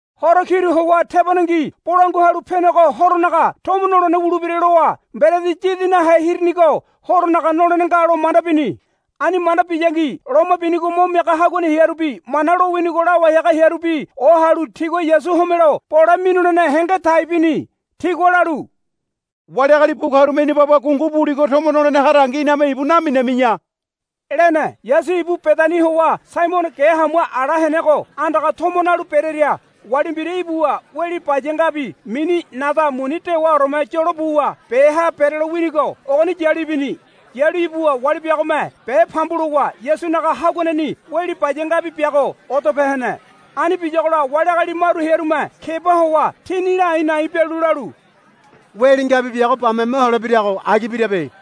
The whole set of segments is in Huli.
Horo kiru howa tebonengi Bolangua Halu Penego Horonaga tomo nolene wulebira lowa Mberedi Yidi Nahe Hirinigo Horonaga nolene nga lo manda bini. Ani manda biyangi loma binigo mo miaga haguane hearubi Mana lowinigo lawai haga hearubi ohalu tigua Yasu homelo bole minulene henge tai bini. Tigua lalu, Wali agali bu karume ina baba gungu buligo tomo nolene harangi iname ibu naminami̱ya, lene. Yasu ibu Bedani howa Saimono ge hamua ala henego andaga tomo nalu berearia wali mbira ibuwa weli baya ngabi mini nada muni dewaoreme yolo buwa beha berelo winigo ogoni yalu ibini. Yalu ibuwa wali biagome be pambu lowa Yasunaga haguaneni weli baya ngabi biago odope hene. Ani biyagola wali agali maru hearume keba howa tini la a̱i̱ na̱i̱ bialu lalu, Weli ngabi biago bame mohole birago agi birabe.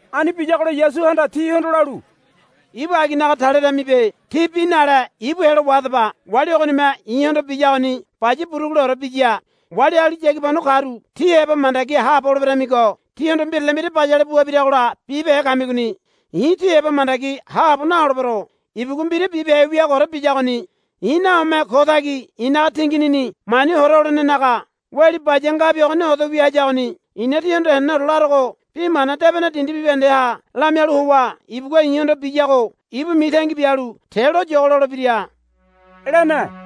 Ani biyagola Yasuhanda tihondo lalu, Ibu aginaga taleremibe. Tí bi nale ibu helo wahadaba. Wali ogonime i̱hondo biyagoni baya buruguleore biya. Wali agali yagibano karu tí heba mandagi haabo holeberemigo tihondo mbirale mbira bayale bua biragola bibehe kamigoni. I̱ tí heba mandagi haabo naholebero. Ibugua mbira bibehe wiagoore biyagoni. I̱ nahome ko tagi i̱naga tinginini mani hora holenenaga weli baya ngabi ogoni odo wia hayagoni. I̱na tíhondo henene larogo bi mana debene dindi bibahendeha lamialu howa ibugua i̱hondo biyago ibu mitangi bialu te loyogo lolebira, lene.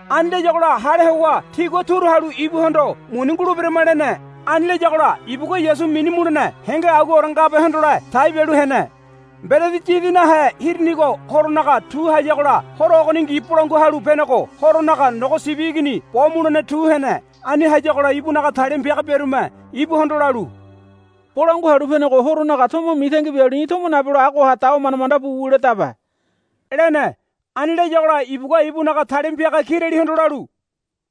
Ani layagola hale howa tigua turu halu ibuhondo, Muni nguleberama, lene. Ani layagola ibugua Yasu minu mulene henge aguaore ngabe hondole tai bialu hene. Mberedi Yidi Nahe Hirinigo Horonaga tu hayagola horo ogoningi Bolangua Halu Penego Horonaga nogo sibi igini bo mulene tu hene. Ani hayagola ibunaga talima piaga biarume ibuhondo lalu, Bolangua Halu Penego Horonaga tomo mitangi bialu í̠ tomo nabelo agoha dawa manda manda bu wuledabe, lene. Ani layagola ibugua ibunaga talima piaga kiralihondo lalu,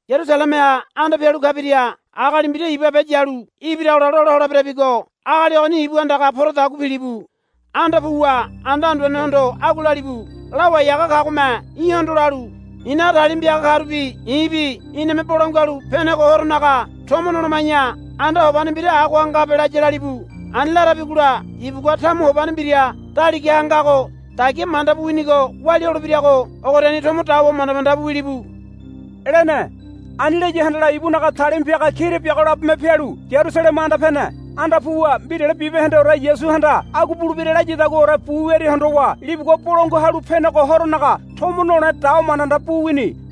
Yarusalemeha anda pialu kabiria agali mbira iba be yalu ibiragola lola holeberabigo agali ogoni ibu anda poradagua pilibu. Anda puwa anda anduanehondo agua lalibu, Lawai haga kagome í̠hondo lalu, I̱naga talima piaga karubi i̱bi iname Bolangua Halu Penego Horonaga tomo noloma̱ya anda hobane mbira agoha ngabe, laya, lalibu. Ani larabigola ibugua tamu hobane mbira daligaha ngago dagia manda bu winigo walia holebirago ogoriani tomo dawa manda manda bu wilibu, lene. Ani laya handala ibunaga talima piaga kira biago labome pialu Yarusaleme anda pene. Anda puwa mbirale bibahendeore Yasuhanda agua bulebira layadaguaore bu wiaria hondowa libugua Bolangua Halu Penego Horonaga tomo nole dawa manda manda bu wini.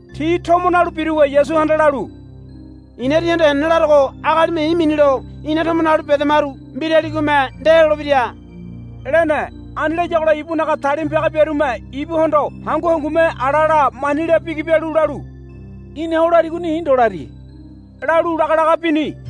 Ti tomo nalu biruwa Yasuhanda lalu, I̱na tíhondo henene larogo agalime i̱ minilo ina tomo nalu bedamaru mbiraligome ndelolebira, lene. Ani layagola ibunaga talima piaga biarume ibuhondo hangu hangume ala la mani la bigi bialu lalu, Í̠na o larigoni i̱ ndo lari, lalu laga laga bini.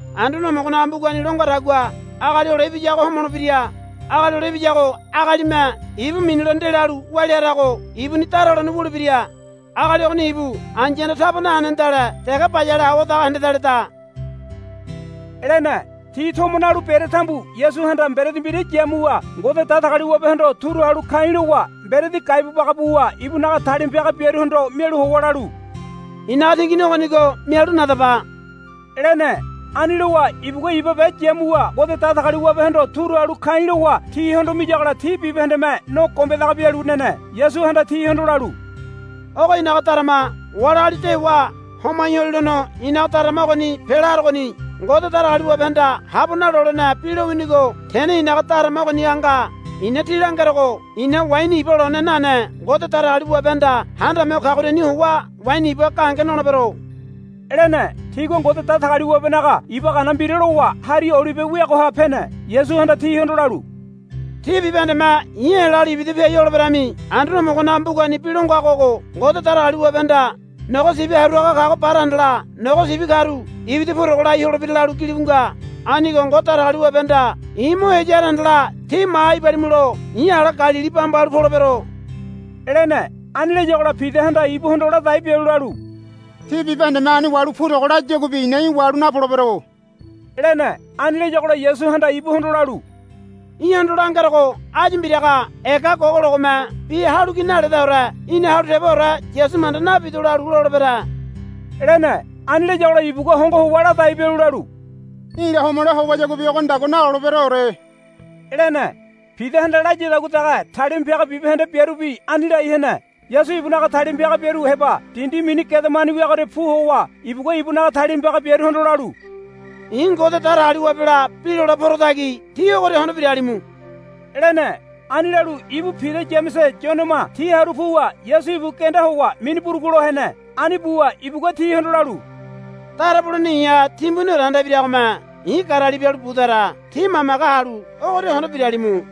Anduane Homogonaga mbugani lo ngadagua Agali Hole Ibiyago homolebira. Agali Hole Ibiyago agalime ibu minilo ndelalu walia harago ibuni dara holene wulebira. Agali ogoni ibu ai̱yahanda taba nahenedale dege bayale awadaga hendedaleda, lene. Ti tomo nalu berea tambu Yasuhanda mberedi mbira yamuwa Ngode Datagaliwabehondo turu halu ka̱i̱ lowa mberedi gaibu baga buwa ibunaga talima piaga biaruhondo mialu howa lalu, I̱naga tingini ogonigo mialu nadaba, lene. Ani lowa ibugua iba be yamuwa Ngode Datagaliwabehondo turu halu ka̱i̱ lowa tihondo miyagola ti bibahendeme no gombedaga bialu nene. Yasuhanda tihondo lalu, Ogo i̱naga darama. Wali agali dewa homai holilono i̱naga darama ogoni pela harogoni. Ngode Datagaliwabehanda habo nalolene bi lowinigo tene i̱naga darama ogoniha nga. I̱na tí langerogo i̱na waini iba lone nane Ngode Datagaliwabehanda Handame Ho Kagoriani howa waini iba gahenge nolebero, lene. Tigua Ngode Datagaliwabenaga iba gana mbira lowa Hari Olibe weagoha pene. Yasuhanda tihondo lalu, Tí bibahendeme i̱ helalu ibida piai holeberami. Anduane Homogonaga mbugani bi lo ngago ogo, Ngode Datagaliwabehanda nogo sibi haru haga kago bara handala nogo sibi karu ibida purogo lai holebira, lalu gilibu nga. Anigo Ngode Datagaliwabehanda i̱ mo heya hara handala tí maha ibalimulo i̱ ala Galili bamba halu polebero, lene. Ani layagola Pidahanda ibuhondo ladai bialu lalu, Ti bibahendeme ani wahalu purogo layaguabi i̱na í̠ wahalu napolebero, lene. Ani layagola Yasuhanda ibuhondo lalu, Í̠hondo langerogo áyu mbiraga ega gogologome bi halu ki naledaore í̠na halu teboore Yasu manda nabido lalu lolebere, lene. Ani layagola ibugua hongo howa ladai bialu lalu, Í̠la homole howayaguabi ogonidagua naloleberoore, lene. Pidahanda layadagua dege talima piaga bibahende biarubi ani lai hene. Yasu ibunaga talima piaga biaru heba dindi mini Gedemani wiagoria pu howa ibugua ibunaga talima piaga biaruhondo lalu, I̱ Ngode Datagaliwabela bi lole porotagi tí ogoria hondo biralimu, lene. Ani lalu ibu Pida Yamese Yonema ti haru puwa Yasu ibu genda howa mini burugulo hene. Ani buwa ibugua tihondo lalu, Dara bulene i̱ha timbuniore anda ibiragome i̱ garali bialu budara. Tí mamage halu ogoria hondo biralimu,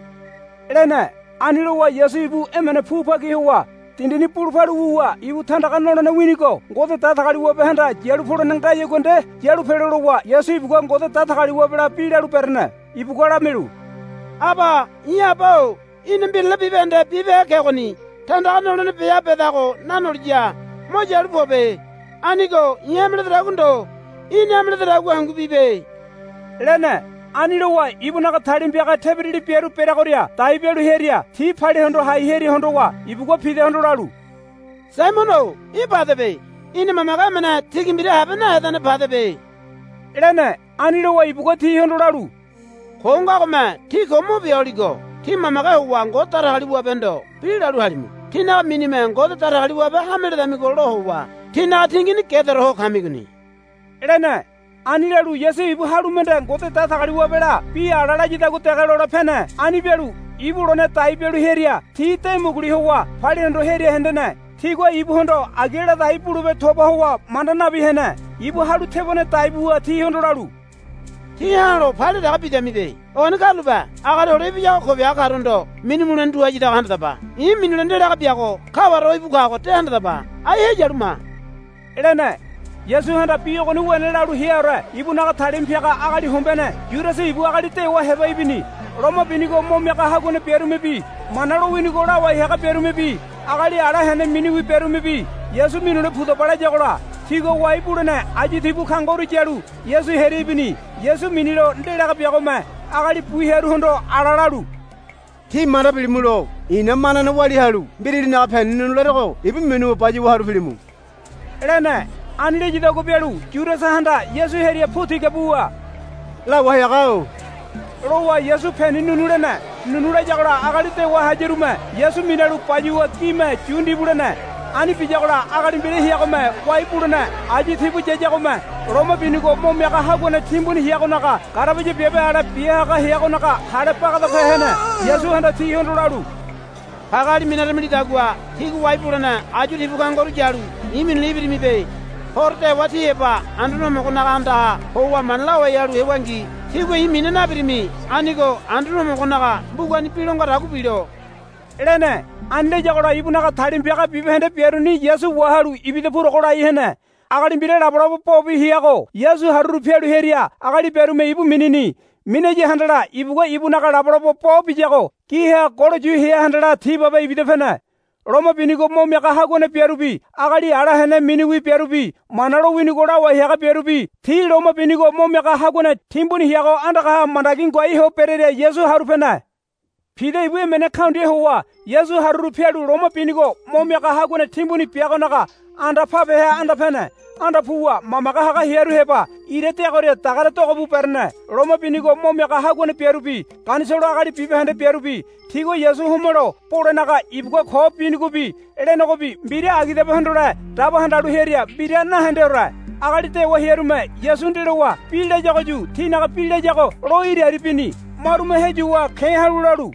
lene. Ani lowa Yasu ibu emene pu bagi howa dindini bulu palu wuwa ibu tandaga nolene winigo Ngode Datagaliwabehanda yalu polene ngayagua nde yalu pelo lowa Yasu ibugua Ngode Datagaliwabela bi lalu berene. Ibugua lamialu, Aba i̱ Aba-o í̠na mbirale bibahende bibehe kegoni. Tandaga nolene beha bedago nanoliya mo yalu pobe. Anigo i̱ hame ledodagua ndo í̠na hame lededagua hangu bibe, lene. Ani lowa ibunaga talima piaga tebirali biaru bereagoria dai bialu hearia ti palia hondo hai hearia hondowa ibugua Pidahondo lalu, Saimono-o í̠ padebe. Í̠na mamage emene tigi mbira habe nahedane padebe, lene. Ani lowa ibugua tihondo lalu, Ko ngagome tí ko mo bia holigo tí mamage howa Ngode Datagaliwabehondo bi lalu halimu. Tínaga minime Ngode Datagaliwabe hame ledamigo lo howa tínaga tingini gedaore ho kamigoni, lene. Ani lalu Yasu ibu halu mende Ngode Datagaliwabela bi ala layadagua dege lole pene. Ani bialu ibu lone dai bialu hearia ti de muguli howa palia hondo hearia hendene. Tigua ibuhondo agi ladai bulebe toba howa manda nabi hene. Ibu halu tebone dai buwa tihondo lalu, Tí ha̱lo palia dege bidamibe. Ogoni karulape. Agali Hole Ibiyago ko biaga karuhondo minu mulene tu hayadago handadaba. I̱ minilo ndelaga biago kaware o íbu kago de handadaba. Ai heyalu ma, lene. Yasuhanda bi ogoni wene lalu heaore ibunaga talima piaga agali hombeane Yudasa ibu agali dewa heba ibini. Loma binigo mo miaga haguane biarumebi Mana lowinigo lawai haga biarumebi agali ala hene miniwi biarumebi, Yasu minule pudaba, layagola tigua wai bulene ayu tibu kangoru yalu Yasu hearia ibini. Yasu minilo ndelaga biagome agali bu hearuhondo ala lalu, Tí manda bilimulo i̱na manane walia halu mbiralinaga peni nu̱nu̱ larogo ibu minuwa bayuwa haru pilimu, lene. Ani layadagua bialu Yudasahanda Yasu hearia pu tiga buwa, Lawai haga-o, lowa Yasu peni nu̱nu̱ lene. Nu̱nu̱ layagola agali dewa hayarume Yasu minalu bayuwa gime yu ndibu lene. Ani biyagola agali mbira heagome wai bulene ayu tibu yayagome loma binigo mo miaga haguane timbuni heagonaga garabaya biabe ale bia haga heagonaga hale bagadape hene. Yasuhanda tihondo lalu, Pageali minaramilidagua tígua wai bulene ayu tibu kangoru yalu i̱ minule ibirimibe. Horo dewa tí heba Anduane Homogonaga andaha howa mana lawai halu hewangi tígua i̱ mina nabirimi. Anigo Anduane Homogonaga mbugani bi lo ngadagua bilo, lene. Ani layagola ibunaga talima piaga bibahende biaruni Yasu wahalu ibida purogo lai hene. Agali mbira labolabo bobi heago Yasu haruru pialu hearia agali biarume ibu minini. Minaya handala ibugua ibunaga labolabo bo biyago giha golo yu hea handala ti babe ibida pene. Loma binigo mo miaga haguane biarubi agali ala hene miniwi biarubi Mana lowinigo lawai haga biarubi ti loma binigo mo miaga haguane timbuni heago andagaha mandagi ngoai ho berearia Yasu haru pene. Pida ibu emene kaundia howa Yasu haruru pialu loma binigo mo miaga haguane timbuni biagonaga anda pabeha anda pene. Anda puwa mamage haga hearu heba ira deagoria dagare dogo bu berene. Loma binigo mo miaga haguane biarubi Ganisolo agali bibahende biarubi tigua Yasu homelo bolenaga ibugua ko binigobi lenegobi mbira agidabe hondole daba handalu hearia mbira nahendeore. Agali dewa hearume Yasu ndelowa bi layagoyu tinaga bi layago lo iriari bini. Marume heyuwa ke̱ halu lalu,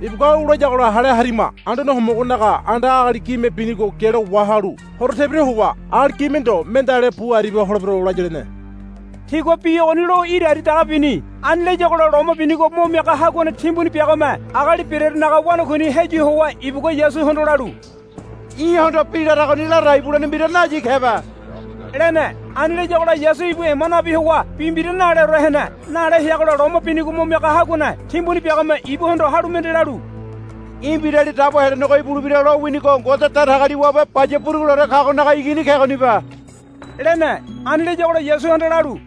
Ibugua au layagola hale harima. Anduane Homogonaga anda agali gime binigo gialo wahalu horo tebira howa agali gime ndo mendeale bu aribia holebero, laya, lene. Tigua bi ogoni lo iriari dege bini. Ani layagola Loma Binigo Mo Miaga Haguane Timbuni biagome agali berearunaga wanakuini heyu howa ibugua Yasuhondo lalu, Í̠hondo bi laragoni ladai bulene mbira nayi kebe, lene. Ani layagola Yasu ibu ema nabi howa bi mbira naleore hene. Nale heagola Loma Binigo Mo Miaga Haguane Timbuni biagome ibuhondo halu mende lalu, Í̠ Mbirali Dabo Helenego ibulebira lowinigo Ngode Datagaliwabe Baya Buruguleore Kagonaga Igini kegonibe, lene. Ani layagola Yasuhanda lalu,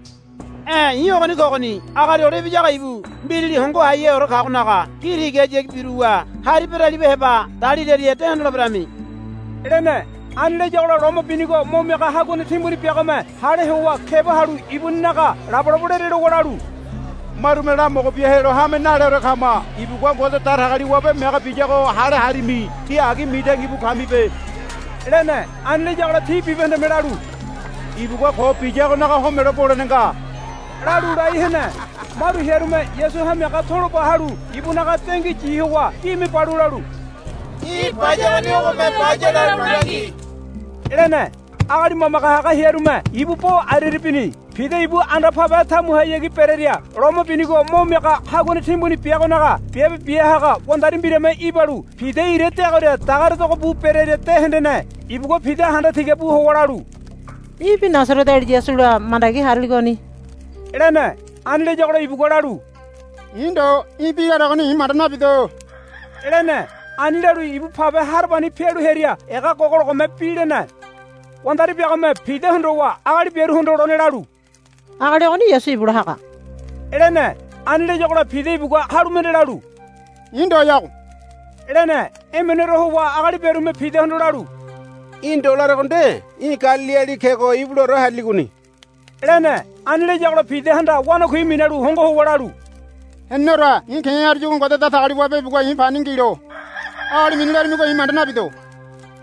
E̱ i̱ ogoni kogoni. Agali Hole Ibiyago ibu Mbirali Hongo Haiheore Kagonaga gi tigahayagi biruwa hari beraliba heba daliraria de hondoleberami, lene. Ani layagola Loma Binigo Mo Miaga Haguane Timbuni biagome hale howa keba halu ibuninaga labolabo lerelowa lalu, Marume lamogo bia helo hame naleore kama. Ibugua Ngode Datagaliwabe mege biyago hale harimi. Tí agi mitangi bu kamibe, lene. Ani layagola ti bibahendeme lalu, Ibugua ko biyagonaga homelo bolene nga, lalu lai hene. Maru hearume Yasu hamiaga tolo ba halu ibunaga dengui yi howa gime balu lalu, Í̠ bayagoni ogome baya lalu langi, lene. Agali mamage haga hearume ibu bo ariari bini. Pida ibu anda pabe tamuhayagi berearia loma binigo mo miaga haguane timbuni biagonaga biabe bia haga wandari mbirame ibalu Pida ira deagoria dagare dogo bu berearia de hendene. Ibugua Pida handa tiga howa lalu, Í̠bi Nasareteali Yasula mandagi hariligoni, lene. Ani layagola ibugua lalu, I̱ ndo í̠ bi laregoni i̱ manda nabido, lene. Ani lalu ibu pabe harabani pialu hearia ega gogologome bi lene. Wandari biagome Pida hondowa agali biaruhondo lone lalu, Agali ogoni Yasu ibula haga, lene. Ani layagola Pida ibugua halu mende lalu, I̱ ndoyago, lene. Emeneore howa agali biarume Pidahondo lalu, Í̠ ndo larego nde í̠ Galiliali kego ibulaore hariligoni, lene. Ani layagola Pidahanda wanakui minalu hongo howa lalu, Heneneore i̱ ke̱ haruyagua Ngode Datagaliwabe ibugua i̱ pani ngilo, lalu, Agali mini larimigo i̱ manda nabido,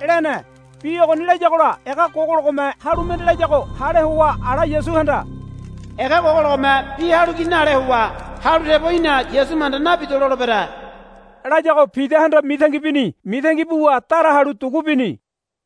lene. Bi ogoni layagola ega gogologome halu mende layago hale howa ala Yasuhanda, Ega gogologome bi halu ki nale howa halu tebo í̠na Yasu manda nabido lolebere, layago Pidahanda mitangi bini. Mitangi buwa dara halu dugu bini.